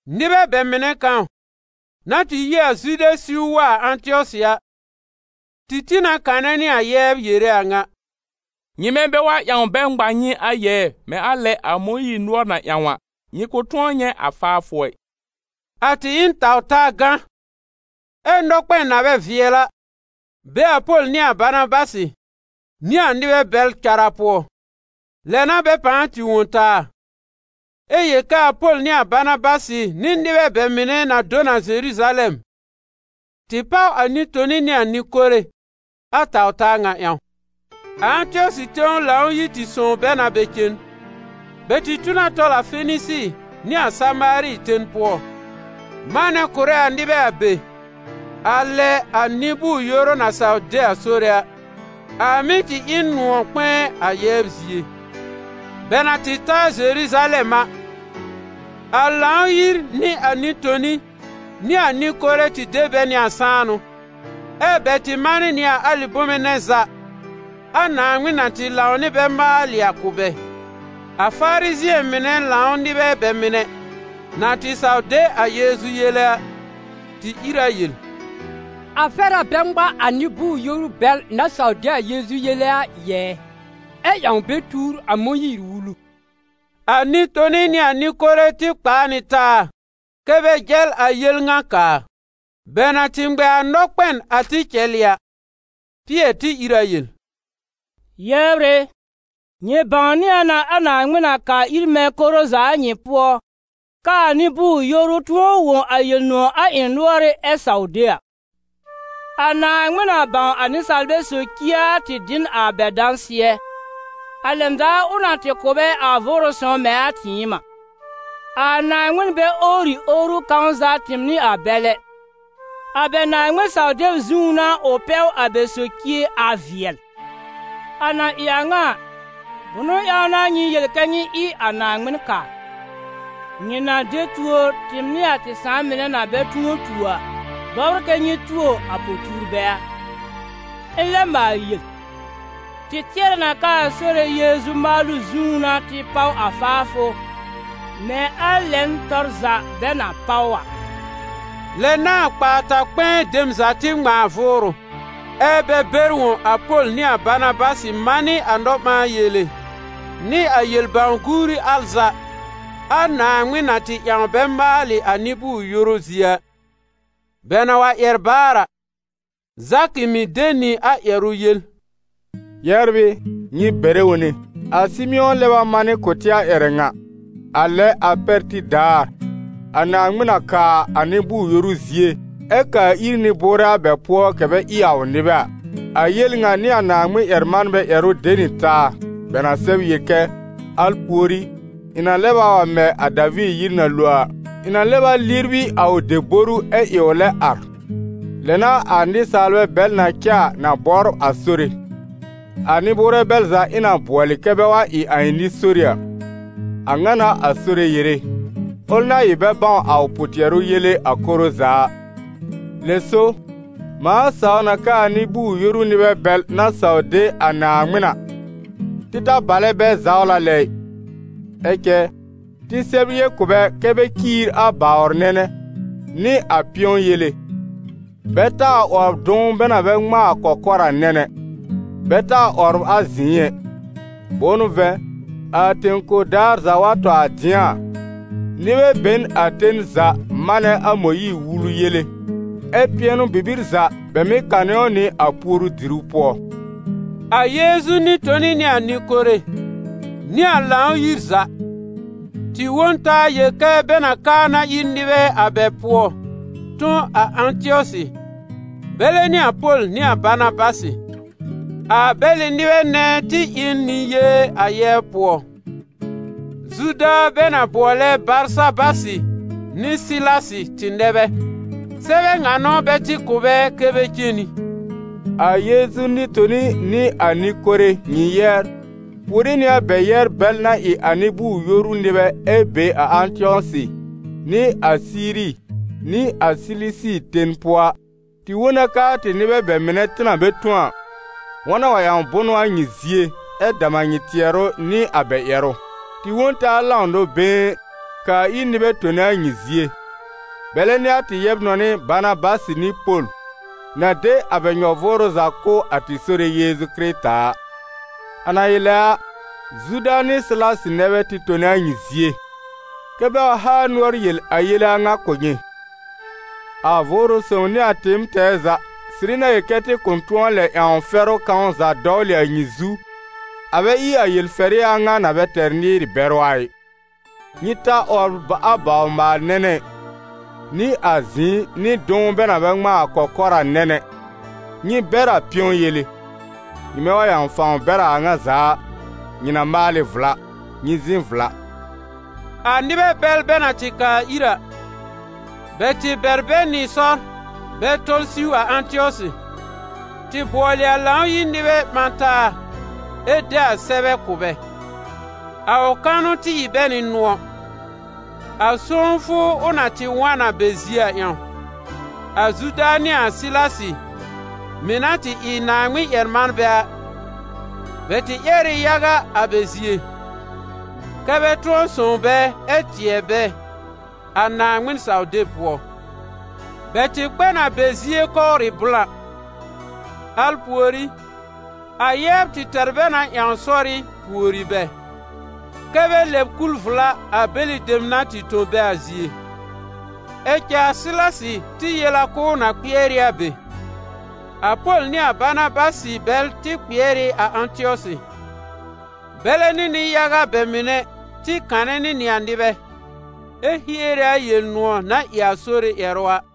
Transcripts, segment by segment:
Nɩbɛ bɛ mɩnɛ kãw, na tɩ yi a Zude siw wa a Ãtɩɔsɩ a, tɩ tĩ na kanɛ nɩ a yɛbr yere a ŋa: «Nyɩmɛ bɛ wa ƴãw bɛ ŋma nyɩ a yɛɛ, mɛ̃ a lɛ a Mõyiir nʋɔr na ƴãw a, nyɩ kʋ̃ tʋ̃ɔ nyɛ̃ a faafʋ ɛ.» A tɩ ɩ n taw-taa gã, ɛ nɔkpɛn na bɛ vɩɛl a be a Pol nɩ a Banabasɩ nɩ a nɩbɛ bɛl cara pʋɔ. Lɛ n'a bɛ pãa tɩ wõ ta, ɛ yel kɛ a Pol nɩ a Banabasɩ nɩ nɩbɛ bɛ mɩnɛ na do n a Zeruzalɛm, tɩ páw a nɩ-toni nɩ a nɩ-kore a taw-taa ŋa ƴãw. A Ãtɩɔsɩ tẽw Lãw-yir tɩ sõw bɛ na bɛ cen. Bɛ tɩ tu na tɔl a Fenisi nɩ a Samaari ten pʋɔ, manɛ kʋ̀rɛ a nɩbɛ a be, a lɛ a nɩ-bʋʋr-yoru na saw de a Sore a. A mɩ́ tɩ ɩ n nʋ̃ɔ̀ kpɛ̃ɛ a yɛbr zie. Bɛ na tɩ ta a Zeruzalɛm a, a Lãw-yir nɩ a nɩ-toni nɩ a nɩ-kore tɩ de bɛ nɩ a sãanʋ, ɛ́ bɛ tɩ manɩ a alɩ bome nɛ za a Naaŋmɩn na tɩ lãw nɩ bɛ maalɩ a kʋ̀ bɛ. A Farizɩ̃ɛ mɩnɛ lãw nɩbɛ bɛ mɩnɛ, na tɩ saw de a Yeezu yele a, tɩ ìr a yel: «A fɛr a bɛ ŋma a nɩ-bʋʋr-yoru bɛl na saw de a Yeezu yele a yɛɛ, ɛ ƴãw bɛ tuur a Mõyiir-Wulu.» A nɩ-toni nɩ a nɩ-kore tɩ kpaa nɩ taa kɛ́ bɛ jɛl a yel ŋa kaa. Bɛ na tɩ ŋmɛ a nɔkpɛn a tɩ cɛlɩ a, Pɩɛr tɩ ìr a yel: «Yɛbr ɩ, nyɩ bãwnɩ a na a Naaŋmɩn na kaa ir mɛ̃ koro za a nyɩ pʋɔ, k'aa nɩ-bʋʋr-yoru tʋ̃ɔ wõ a Yel-nʋ̃ɔ̀ a ɩ̃ nʋ́ɔrɩ́ ɛ saw de a. A Naaŋmɩn na bãw a nɩsaalbɛ socie a tɩ dɩ n a bɛ dãsɩɛ, a lɛn daar ʋ na tɩ kʋ̀ bɛ a Vʋʋrʋ Sõw mɛ̃ a tɩɩm a. A Naaŋmɩn bɛ owri owru kãw za tɩɩm nɩ a bɛl ɛ, a bɛ Naaŋmɩn-saw-deb zũú n'a ʋ pɛw a bɛ socie a vɩɛl. A na ɩ a ŋa a, bʋnʋ ƴãw n'a nyɩ yel kɛ nyɩ ɩ a Naaŋmɩn kaa? Nyɩ na de tuor, tɩɩm nɩ a tɩ sãà mɩnɛ na bɛ tʋ̃ɔ tuo a, bɔbr kɛ nyɩ tuo a po-tuurbɛ a? Ɩ̃ lɛb maal yel: tɩ tɩɛrɛ na k'aa Sore Yeezu maalʋ zũú n'a tɩ páw a faafʋ mɛ̃ a lɛn tɔr za bɛ na páw a.» Lɛ n'a a kpaa-ta-kpɛ̃ɛ dem za tɩ ŋmãa vʋʋrʋ, ɛ bɛ bɛr wõ a Pol nɩ a Banabasɩ manɩ a nɔ-ɓãa-yele nɩ a yel-bãw-guuri al za a Naaŋmɩn na tɩ ƴãw bɛ maalɩ a nɩ-bʋʋr-yoru zie a. Bɛ na wa ƴɛr baar a, Zakɩ mɩ̀ tɩ de nɩ a ƴɛrʋ yel: «Yɛbr ɩ, nyɩ bɛrɛ wone. A Sɩmɩ̃ɔ lɛb a manɩ kʋ̀ tɩ a ƴɛrɛ ŋa, a lɛ a pɛr tib daar, a Naaŋmɩn na kaa a nɩ-bʋʋr-yoru zie, ɛ kaa ir nɩ-bʋʋrɛ a bɛ pʋɔ kɛ bɛ ɩ a ʋ nɩbɛ a. A yel ŋa nɩ a Naaŋmɩn-ƴɛr-manbɛ ƴɛrʋ de nɩ taa, bɛ na sɛb yel kɛ: ‹Al pùorí, ɩ̃ na lɛb wa wa mɛ a Daviir yir na lo a, ɩ̃ na lɛb a libri a ʋ deboru, ɛ ɩ ʋ lɛ ar. Lɛ n'a a nɩsaalbɛ bɛl na cɛ a na bɔbr a Sore, a nɩ-bʋʋrɛ bɛl za ɩ̃ na bʋɔlɩ kɛ bɛ wa ɩ a ɩ̃ nɩ-sori a. A ŋa n'a a Sore yere, ʋl na ɩ bɛ bãw a ʋ pʋ-tɩɛrʋ yele a koro za a.›» «Lɛ so, mãa saw na k'aa nɩ-bʋʋr-yoru nɩbɛ bɛl na saw de a Naaŋmɩn a, tɩ ta balɛ bɛ zawla lɛ ɩ. Ɛ cɛ tɩ sɛb yel kʋ̀ bɛ kɛ́ bɛ ciir a bawr nɛnɛ, nɩ a pɩ̃ɔ yele, bɛ taa 'wɔbr dʋ̃w bɛ na bɛ ŋmãa a kɔkɔr a nɛn ɛ, bɛ taa 'wɔbr a zɩ̃ɩ ɛ. Bʋ̃ʋ n'ʋ vɛ̃, a tẽ-kor daar za wa tɔ a dɩ̃a a, nɩbɛ be n a ten za manɛ a Mõyiir-Wulu yele, ɛ pɩɛnʋ-bibir za, bɛ mɩ́ kanɩ ʋ nɩ a puoru-diru pʋɔ.» A Yeezu nɩ-toni nɩ a nɩ-kore, nɩ a Lãw-yir za, tɩ wõ n taa yel kɛ́ bɛ na kaa na ir nɩbɛ a bɛ pʋɔ tõ a Ãtɩɔsɩ, bɛlɛ nɩ a Pol nɩ a Banabasɩ. A bɛlɩ nɩbɛ nɛ tɩ ɩ n nɩ-yee a yɛbr pʋɔ: Zuda bɛ na bʋɔlɛ Barsabasɩ nɩ Sɩlasɩ tɩ nɛ bɛ. Sɛbɛ ŋa n'ʋ bɛ tɩ kʋ̀ bɛ kɛ́ bɛ cen nɩ: «A Yeezu nɩ-toni nɩ a nɩ-kore, nyɩ yɛbr, puore nɩ a bɛ yɛbr bɛl na ɩ a nɩ-bʋʋr-yoru nɩbɛ ɛ be a Ãtɩɔsɩ, nɩ a Siiri nɩ a Silisi ten pʋɔ a. Tɩ wõ na k'aa tɩ nɩbɛ bɛ mɩnɛ, tɩ na bɛ tõ a, wa na wa ƴãw bʋnʋ a nyɩ zie, ɛ dam a nyɩ tɩɛrʋ nɩ a bɛ ƴɛrʋ. Tɩ wõ n taa lãw nɔ-been, kaa ir nɩbɛ tone a nyɩ zie, bɛlɛ nɩ a tɩ yɛb-nɔnɩ Banabasɩ nɩ Pol, na de a bɛ nyɔ-vʋʋrʋ za kʋ̀ a tɩ Sore Yeezu Kɩrɩta a. A na ɩ lɛ a, Zuda nɩ Sɩlasɩ nɛ bɛ tɩ tone a nyɩ zie, kɛ́ bɛ wa haa nʋɔr yel a yele a ŋa kʋ̀ nyɩ. A Vʋʋrʋ Sõw nɩ a tɩɩm tɛɛ za sɩrɩ na yel kɛ tɩ kʋ̃ tʋ̃ɔ lɛ ƴãw fɛrʋ kãw za dɔwlɩ a nyɩ zu, a bɛ ɩ a yel-fɛrɩ a ŋa na bɛ tɛr nɩɩr-bɛrʋ a ɩ: nyɩ ta 'wɔbr a bawr-maal-nɛnɛ ɩ, nɩ a zɩ̃ɩ nɩ dʋ̃w bɛ na bɛ ŋmãa a kɔkɔr a nɛn ɛ, nyɩ bɛr a pɩ̃ɔ yele. Nyɩmɛ wa ƴãw fãw bɛr a a ŋa za a, nyɩ na maal ɩ vla. Nyɩ zɩ̃ vla.» A nɩbɛ bɛl bɛ na tɩ kaa ir a, bɛ tɩ bɛr bɛ nɩ sɔr bɛ tɔl siw a Ãtɩɔsɩ, tɩ bʋɔlɩ a Lãw-yir nɩbɛ ɓã taa ɛ de a sɛbɛ kʋ̀ bɛ. A ʋ kanʋ tɩ ɩ bɛ nɩ nʋ̃ɔ̀, a sõwfʋ ʋ na tɩ wa n a bɛ zie a ƴãw. A Zuda nɩ a Sɩlasɩ mɩ̀ na tɩ ɩ Naaŋmɩn-ƴɛr-manbɛ a, bɛ tɩ ƴɛr ɩ yaga a bɛ zie, kɛ́ bɛ tʋ̃ɔ sõw bɛ ɛ tɩɛ bɛ a Naaŋmɩn-saw-deb pʋɔ. Bɛ tɩ kpɛ n a bɛ zie kɔwrɩ blã. Al pùorí, a yɛbr tɩ tɛr bɛ na ƴãw sɔ́rɩ́ pùori bɛ, kɛ́ bɛ lɛb kul vla a bɛlɩ dem na tɩ tõ bɛ a zie. [ Ɛ cɛ a Sɩlasɩ tɩ yel a k'ʋʋ na kpɩɛr ɩ a be.] A Pol nɩ a Banabasɩ bɛl tɩ kpɩɛr ɩ a Ãtɩɔsɩ. Bɛlɛ nɩ nɩ-yaga bɛ mɩnɛ tɩ kanɛ nɩ nɩ a nɩbɛ, ɛ hiere a Yel-nʋ̃ɔ̀ na ɩ a Sore ƴɛrʋ a.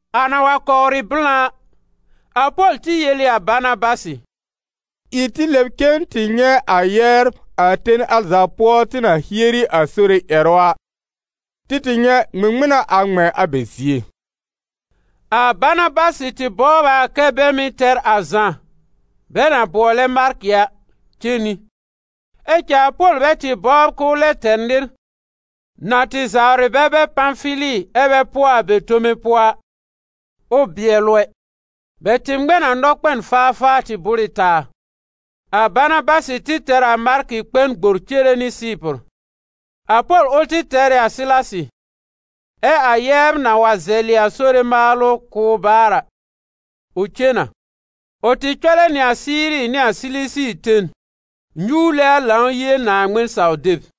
A na wa kɔwrɩ blã a, a Pol tɩ yel ɩ a Banabasɩ: «Ɩ tɩ lɛb cen tɩ nyɛ̃ a yɛbr a ten al za pʋɔ tɩ na hieri a Sore ƴɛrʋ a, tɩ tɩ nyɛ̃ ŋmɩŋmɩn n'a a ŋmɛ̃ a bɛ zie.» A Banabasɩ tɩ bɔbr a kɛ́ bɛ mɩ̀ tɛr a Zã, bɛ na bʋɔlɛ Markɩ a, cen nɩ; ɛ cɛ a Pol bɛ tɩ bɔbr k'ʋʋ lɛ tɛr nɩr, na tɩ zawrɩ bɛ bɛr Pãfili ɛ bɛ pʋɔ a bɛ tome pʋɔ a, ʋ bɩɛl ʋ ɛ. Bɛ tɩ ŋmɛ n a nɔkpɛn faafaa tɩ bʋ́r ɩ taa. A Banabasɩ tɩ tɛr ɩ a Markɩ kpɛ n gbor cere Sɩɩpʋr. A Pol ʋl tɩ tɛr ɩ a Sɩlasɩ, ɛ a yɛbr na wa zɛlɩ a Sore maalʋ kʋ̀ ʋ baar a, ʋ cen na. Ʋ tɩ cɔlɛ nɩ a Siiri nɩ a Silisi ten nyuwle a Lãw-yie Naaŋmɩn-saw-deb.